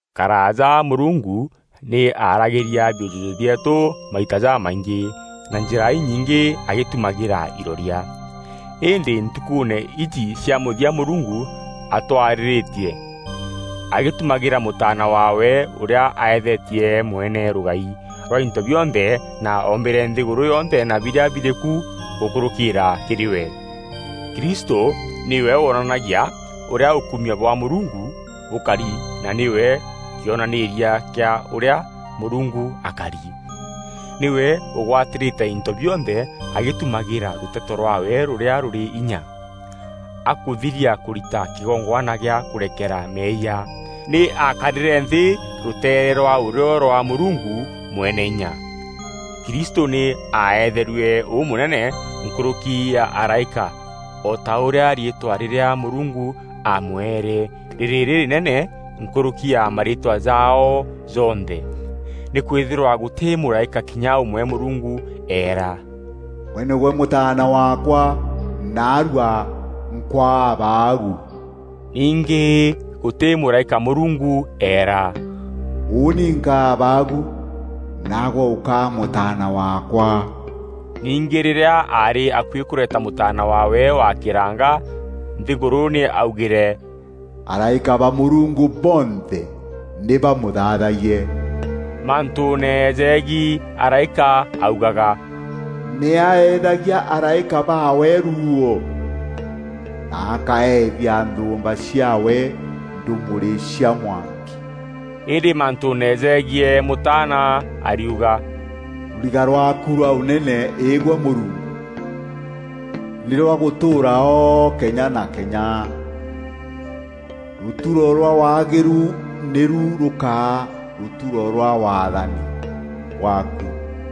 Karaaja Mûrungu nî aaragîria biûjûjû bieetû maita jamaingî na njîra inyingî agîtumagîra iroria. Îndî ntukûûne iji cia mûthia Mûrungu atwarîrîtie agîtumagîra Mûtaana waawe ûrîa aethetie mwene rûgai rwa into bionthe na oombîre nthîgûrû yonthe na birîa birî ku gûkûrûkîîra kîrî we. Kristû nîwe wonanagia ûrîa ûkumio bwa Mûrungu bûkari na nîwe kîonanîîria kîa ûrîa Mûrungu akari. Nîwe ûgwatîrîte into bionthe agîtumagîra rûteto rwaawe rûrîa rûrî inya. Akûthiria kûrita kîgongwana gîa kûrekera meeyia, nî aakarîre nthî rûteere rwa ûrîo rwa Mûrungu Mweneinya. Krîstû nî aaetherue ûmûnene nkûrûki ya araîka o ta ûrîa riîtwa rîrîa Mûrungu aamweere rîrî rîrînene nkûrûki ya mariîtwa jaao jonthe. Nîkwîthîrwa gûtî mûraîka kinya ûmwe Mûrungu eera, “Gwe nîgwe Mûtaana waakwa, naarua nkwaa Abaagu.” Ningî gûtî mûraîka Mûrungu eera, “Ûûni nkaa Abaagu, naagwe ûkaa Mûtaana waakwa.” Ningî rîrîa aarî akuî kûreta Mûtaana waawe wa kîranga nthîgûrû nî augîre, “Araîka ba Mûrungu bonthe nî bamûthaathayie.” Mantûûne jegiî araîka augaga, “Nî aeethagia araîka baawe ruuo, na akaeethia nthûûmba ciaawe ndûmûrî cia mwanki.” Îndî mantûûne jegiî Mûtaana ariuga, “Rûriga rwaaku rwa Ûnene Îgwe Mûrungu, nî rwa gûtûûra o kenya na kenya. Rûturo rwa waagîru nîru rûkaa rûturo rwa waathani bwaaku.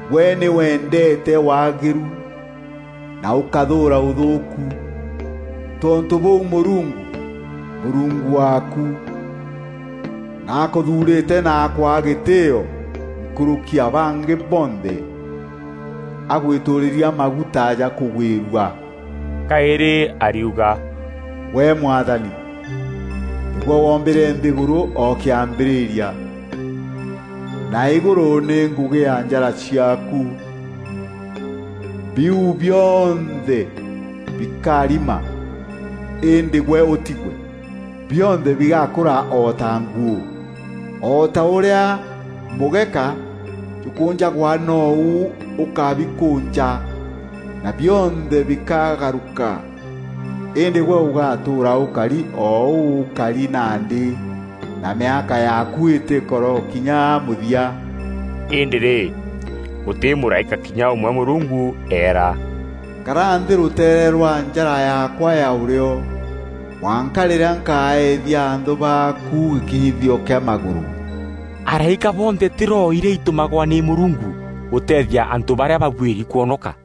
Gwe nî wendeete waagîru na ûkathûûra ûthûûku; tontû bûu Mûrungu, Mûrungu waaku, nî akûthuurîte na akwaa gîtîîo nkûrûki ya bangî bonthe agwîtûûrîria maguta ja kûgwîrua.” Kaîrî ariuga, “Gwe, Mwathani, nîgwe wombîre nthîgûrû o kîambîrîria, na îgûrû nî ngûgî ya njara ciaaku, biu bionthe bikarima, îndî gwe ûtigwe, bionthe bigakûra o ta nguû. O ta ûrîa mûgeka jûkûnjagwa nou ûkabikûnja, na bionthe bikagarûka. Îndî gwe ûgatûûra ûkari o ûu ûkari nandî, na mîaka yaaku îtîkarokinya mûthia.” Îndî rî, gûtî mûraîka kinya ûmwe Mûrungu eera, “Kara nthî rûteere rwa njara yaakwa ya ûrîo, mwanka rîrîa nkaethia anthû baaku gîkinyithio kîa magûrû.” Araîka bonthe tî roho irîa itûmagwa nî Mûrungu gûteethia antû barîa babuîri kwonoka?